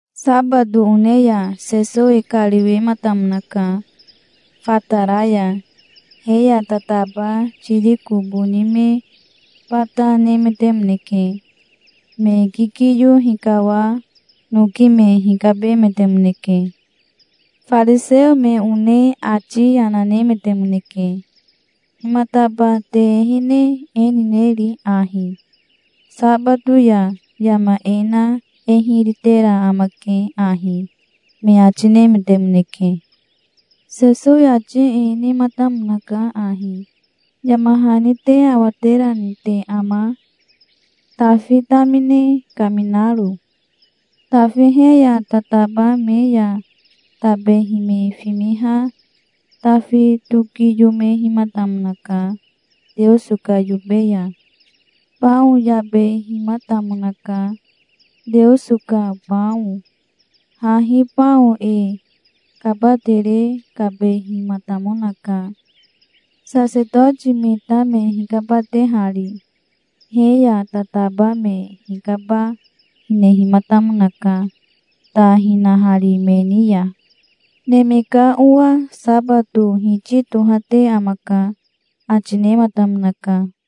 Sabato one ya Sesowi kariwematamonaka fatara ya. He ya tataba tiriko boni me bata nemetemoneke. Me kikiyo hikawa noki me hikabemetemoneke. Fariseo me one ati yana nemetemoneke. "Himataba te ehene e nineri ahi? Sabato ya yama e na e hiri tera amake ahi", me ati nemetemoneke. Sesowi ati e nematamonaka ahi: "Yama hani te awaterani te ama, Tafi tamine kaminaro? Tafi he ya tataba me ya tabehi me fimiha Tafi tokiyomehimatamonaka Teoso ka yobe ya. Bao yabehimatamonaka, Teoso ka bao. Hahi bao e kabatere kabehimatamonaka, sasetoti me ta me hikabatehari. He ya tataba me hikaba hinehimatamonaka, ta hinahari me ni ya. Neme ka Owa sabato Hiti tohate amaka", ati nematamonaka.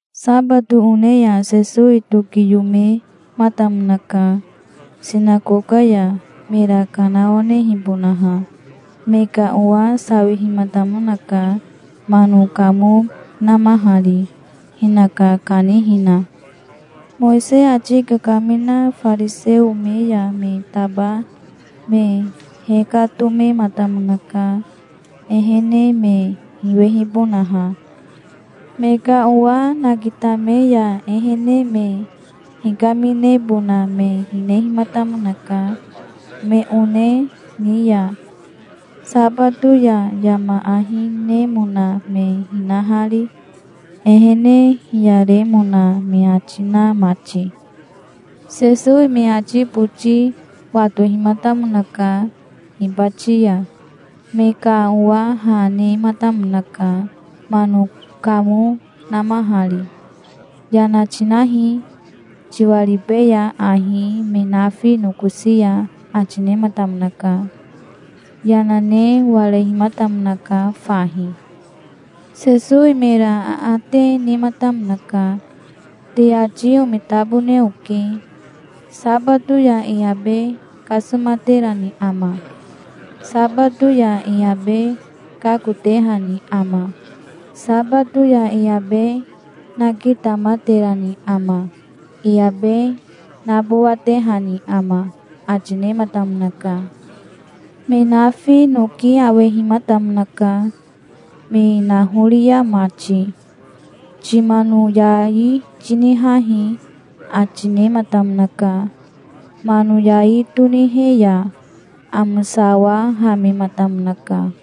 Sabato one ya Sesowi tokiyomematamonaka sinakoka ya, mera kanawanehibonaha. Me ka owa sawihimatamonaka, mano kamo namahari, hinaka kanihina. Mowisei ati kakamina fariseo me ya me taba me hekatomematamonaka, ehene me hiwehibonaha. Me ka owa nakitame ya ehene me hikaminebona me hinehimatamonaka me one ni ya, sabato ya yama ahi nemona me hinahari, ehene hiyaremona me ati na mati. Sesowi me ati boti watohimatamonaka hibati ya. Me ka owa ha nematamonaka, mano kamo namahari. "Yana tinahi, tiwaribeya ahi me nafi nokosi ya", ati nematamonaka. Yana ne warehimatamonaka fahi. Sesowi mera aate nematamonaka. "Te ati omitabone oke. Sabato ya e abe kasomaterani ama? Sabato ya e abe kakotehani ama? Sabato ya e abe nakitamaterani ama? E abe nabowatehani ama?" ati nematamonaka. Me nafi noki awehimatamonaka, me nahoria mati. "Timano yai tinihahi", ati nematamonaka. Mano yai tonihe ya amosawahamematamonaka.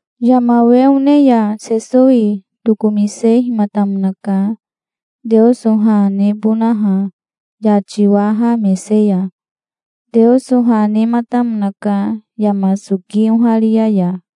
Yama we one ya Sesowi tokomisehimatamonaka Teoso ha nebonaha yati waha mese ya. Teoso ha nematamonaka yama soki oharia ya.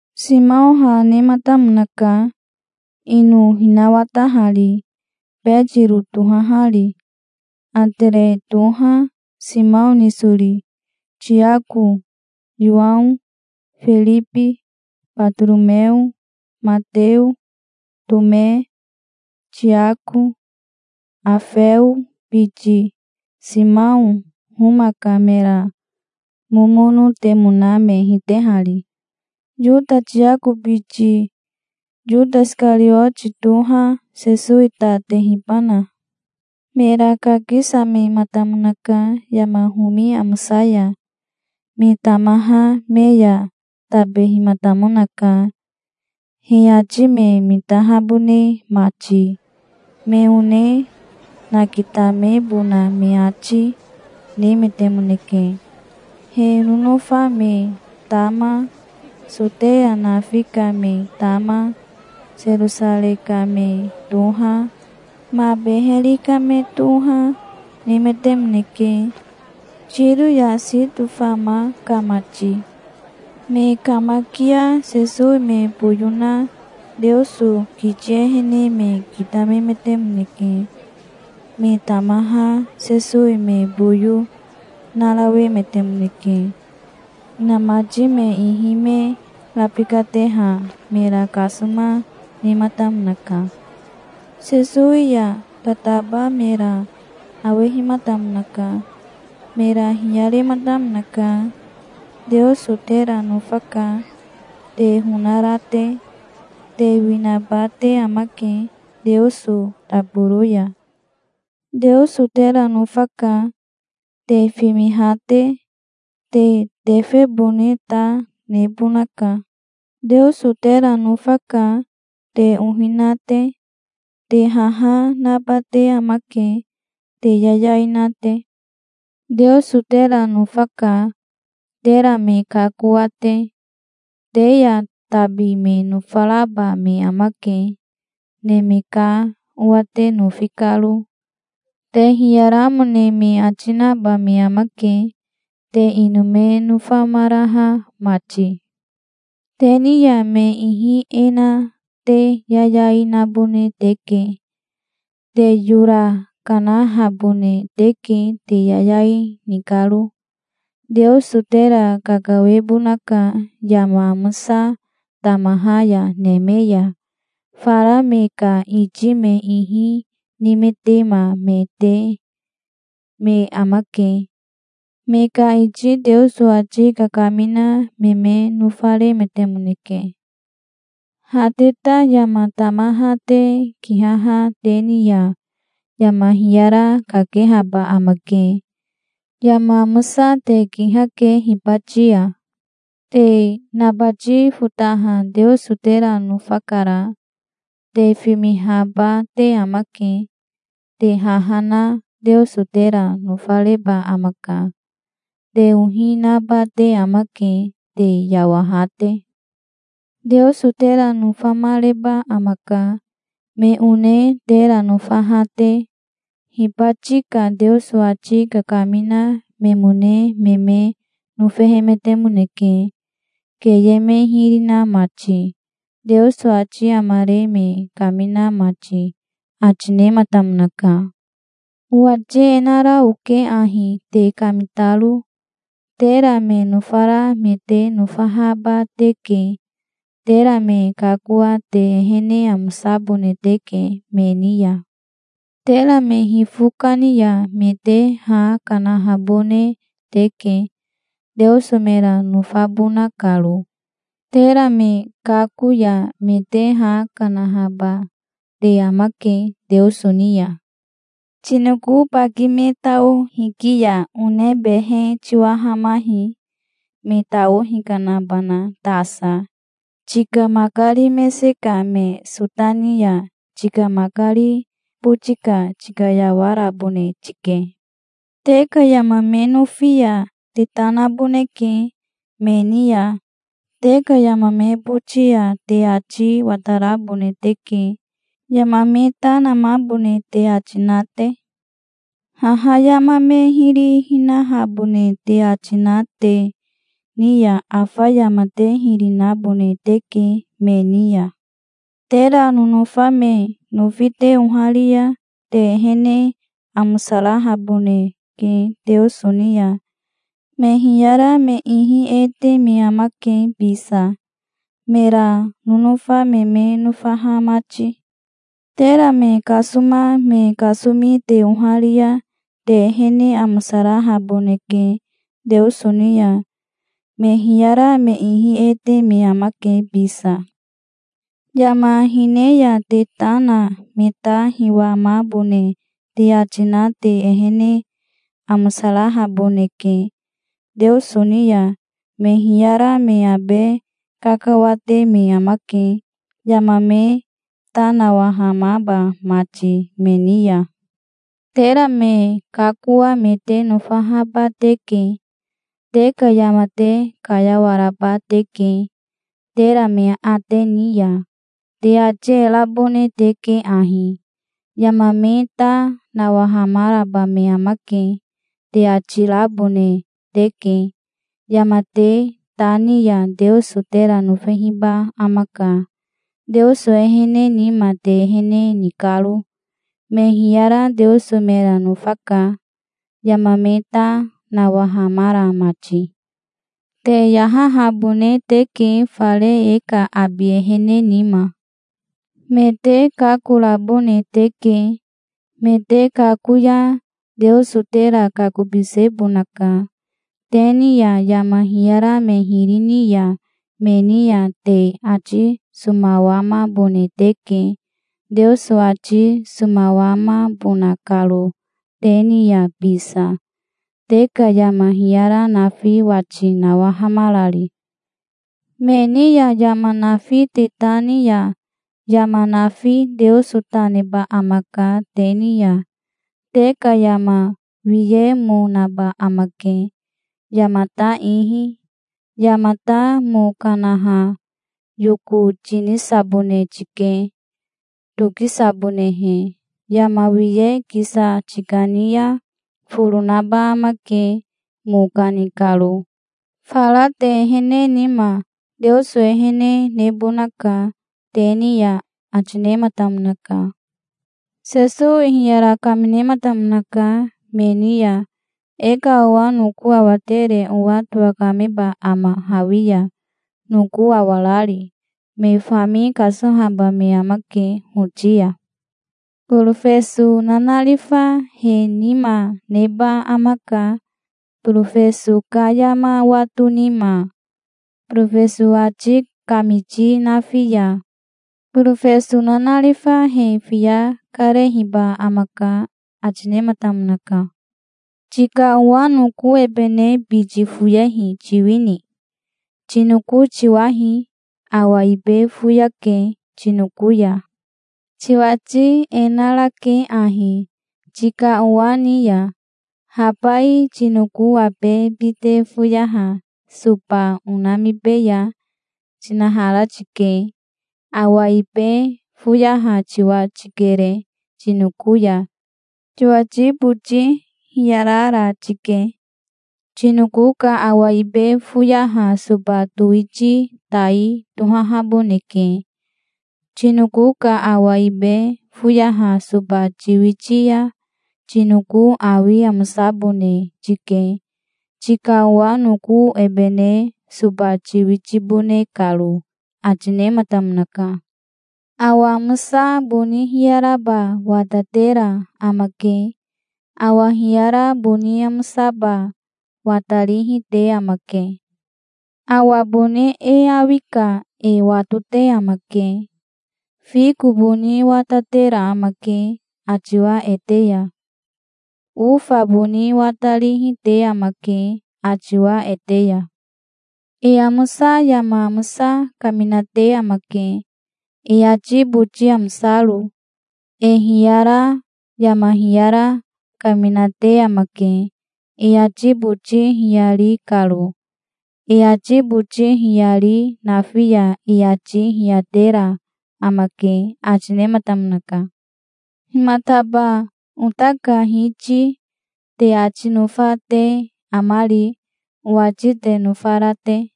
Simao ha nematamonaka, ino hinawatahari, Betiro tohahari. Atere toha, Simao nisori. Tiako, Yowao, Firibi, Batoromeo, Mateo, Tome, Tiako Afeo biti, Simao, Homa ka mera momonotemona me hitehari. Yota Tiako biti, Yota Isikarioti toha, Sesowi ta tehibana. Mera kakisamematamonaka yama homi amosa ya. Me tamaha me ya tabehimatamonaka, he ati me mitahabone mati. Me one nakitamebona me ati, nemetemoneke. He nonofa me tama, Soteya nafi ka me tama, Serosarei ka me toha, ma beheri ka me toha, nemetemoneke, Tiro ya Sito fama ka mati. Me kamakia Sesowi me boyo na Teoso kiti ehene me kitamemetemoneke. Me tamaha Sesowi me boyo narawemetemoneke. Inamati me ihi me rabikateha mera kasoma, nematamonaka. Sesowi ya tataba mera awehimatamonaka. Mera hiyarematamonaka. "Teoso tera nofaka, te honara te. Te winaba te amake Teoso taboro ya". "Teoso tera nofaka, te fimiha te. Te tefebone ta nebonaka". "Teoso tera nofaka, te ohi na te. Te haha naba te amake, te yayai na te". "Teoso tera nofaka, tera me kakoa te. Te ya tabi me nofaraba me amake, Neme ka Owa te nofi karo. Te hiyaramone me ati naba me amake, te ino me nofamaraha mati. Te ni ya me ihi e na te yayai nabone teke. Te yora kanahabone teke te yayai ni karo. Teoso tera kakawebonaka yama amosa tamaha ya neme ya. Fara me ka iti me ihi nimetema me te me amake. Me ka iti Teoso ati kakamina me me nofaremetemoneke". "Ha te ta yama tamaha te kihaha te ni ya yama hiyara kakehaba amake. Yama amosa te kihake hibati ya. Te nabati fotaha Teoso tera nofakara. Te fimihaba te amake. Te haha na Teoso tera nofareba amaka. Te ohi naba te amake, te yawaha te. Teoso tera nofamareba amaka, me one tera nofaha te. Hibati ka Teoso ati kakamina memone me me nofehemetemoneke, keye me hiri na mati, Teoso ati amare me kamina mati", ati nematamonaka. "Owati e nara oke ahi, te kamitaro. Tera me nofara me te nofahaba teke. Tera me kakoa te ehene amosabone teke me ni ya. Tera me hifo kani ya me te ha kanahabone teke, Teoso mera nofabona karo. Tera me kako ya me te ha kanahaba te amake Teoso ni ya. Tinoko baki me tao hiki ya one behe tiwahamahi, me tao hikanabana tasa. Tika makari mese ka me sota ni ya tika makari boti ka tikayawarabone tike. Te ka yama me nofi ya te ta naboneke me ni ya. Te ka yama me boti ya te ati watarabone teke, yama me ta namahabone te ati na te. Haha yama me hiri hinahabone te ati na te ni ya afa yama te hiri nabone teke me ni ya". "Tera nonofa me nofi te oharia te ehene amosarahaboneke Teoso ni ya. Me hiyara me ihi e te me amake bisa, mera nonofa me me nofaha mati. Tera me kasoma me kasomi te oharia te ehene amosarahaboneke Teoso ni ya. Me hiyara me ihi e te me amake bisa. Yama hine ya te ta na me ta hiwamabone te ati na te ehene amosarahaboneke Teoso ni ya. Me hiyara me abe kakawate me amake, yama me ta nawahamaba mati me ni ya. Tera me kakoa me te nofahaba teke. Te ka yama te kayawaraba teke, tera me aate ni ya. Te ati e rabone teke ahi: 'Yama me ta nawahamaraba me amake', te ati rabone teke. Yama te ta ni ya Teoso tera nofehiba amaka, Teoso ehene nima te ehene ni karo. Me hiyara Teoso mera nofaka, yama me ta nawahamara mati". "Te yahahabone teke fare e ka abi ehene nima. Me te kakorabone teke. Me te kako ya Teoso tera kakobisebonaka. Te ni ya yama hiyara me hiri ni ya me ni ya te ati somawamabone teke, Teoso ati somawamabona karo te ni ya bisa, te ka yama hiyara nafi wati nawahamarari. Me ni ya yama nafi te ta ni ya yama nafi Teoso ta neba amaka te ni ya. Te ka yama wiye mo naba amake yamata ihi. Yamata mo kanaha yoko tinisabone tike, tokisabonehe. Yama wiye kisa tikani ya foro naba amake mo kani karo. Fara te ehene nima Teoso ehene nebonaka te ni ya", ati nematamonaka. Sesowi hiyara kaminematamonaka me ni ya. "E ka owa noko awatere owa towakameba ama hawi ya, noko awarari? Me fami kasohaba me amake hoti ya. Borofeso nanarifa he nima neba amaka, borofeso ka yama wato nima, borofeso ati kamiti nafi ya. Borofeso nanarifa he fiya karehiba amaka", ati nematamonaka. "Tika owa noko ebene biti foyehi tiwini? Tinoko tiwahi. Awa ibe foyake tinoko ya. Tiwati e narake ahi tika owa ni ya: 'Habai tinoko abe bite foyaha soba onamibeya', tinahara tike. Awa ibe foyaha tiwa tikere tinoko ya. Tiwati boti hiyarara tike. Tinoko ka awa ibe foyaha soba towiti tai tohahaboneke. Tinoko ka awa ibe foyaha soba tiwiti ya tinoko awi amosabone tike, tika owa noko ebene soba tiwitibone karo", ati nematamonaka. "Awa amosa boni hiyaraba watatera amake. Awa hiyara boni amosaba watarihi te amake. Awa boni e awi ka e watote amake. Fiko boni watatera amake atiwa ete ya. Ofa boni watarihi te amake atiwa ete ya. E amosa yama amosa kaminate amake, e ati boti amosaro. E hiyara yama hiyara kaminate amake, e ati boti hiyari karo. E ati boti hiyari nafi ya e ati hiyatera amake", ati nematamonaka. "Himataba 'Ota ka Hiti' te ati nofa te amari, owati te nofara te?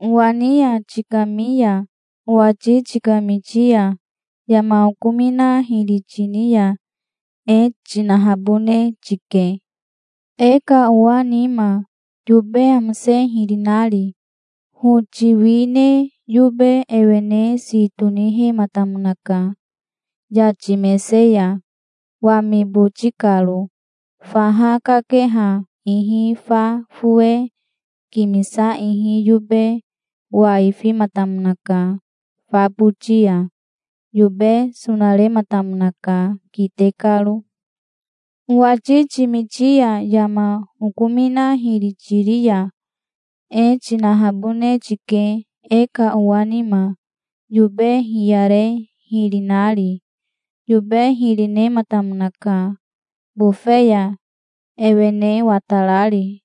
Owa ni ya tikami ya owati tikamiti ya yama okomina hiri tini ya e tinahabone tike, e ka owa nima, yobe amose hiri nari. Hoti wi ne yobe ewene si tonihematamonaka yati mese ya, wami boti karo. Faha kakeha ihi fa fowe kimisa ihi yobe waifimatamonaka fa boti ya. Yobe sonarematamonaka kite karo". "Owati timiti ya yama okomina hiri tiri ya e tinahabone tike e ka owa nima, yobe hiyare hiri nari. Yobe hiri nematamonaka bofe ya ewene watarari.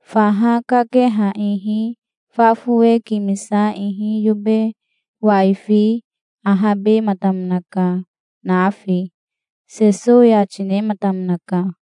Faha kakeha ihi fa fowe kimisa ihi yobe waifi ahabematamonaka nafi", Sesowi ati nematamonaka.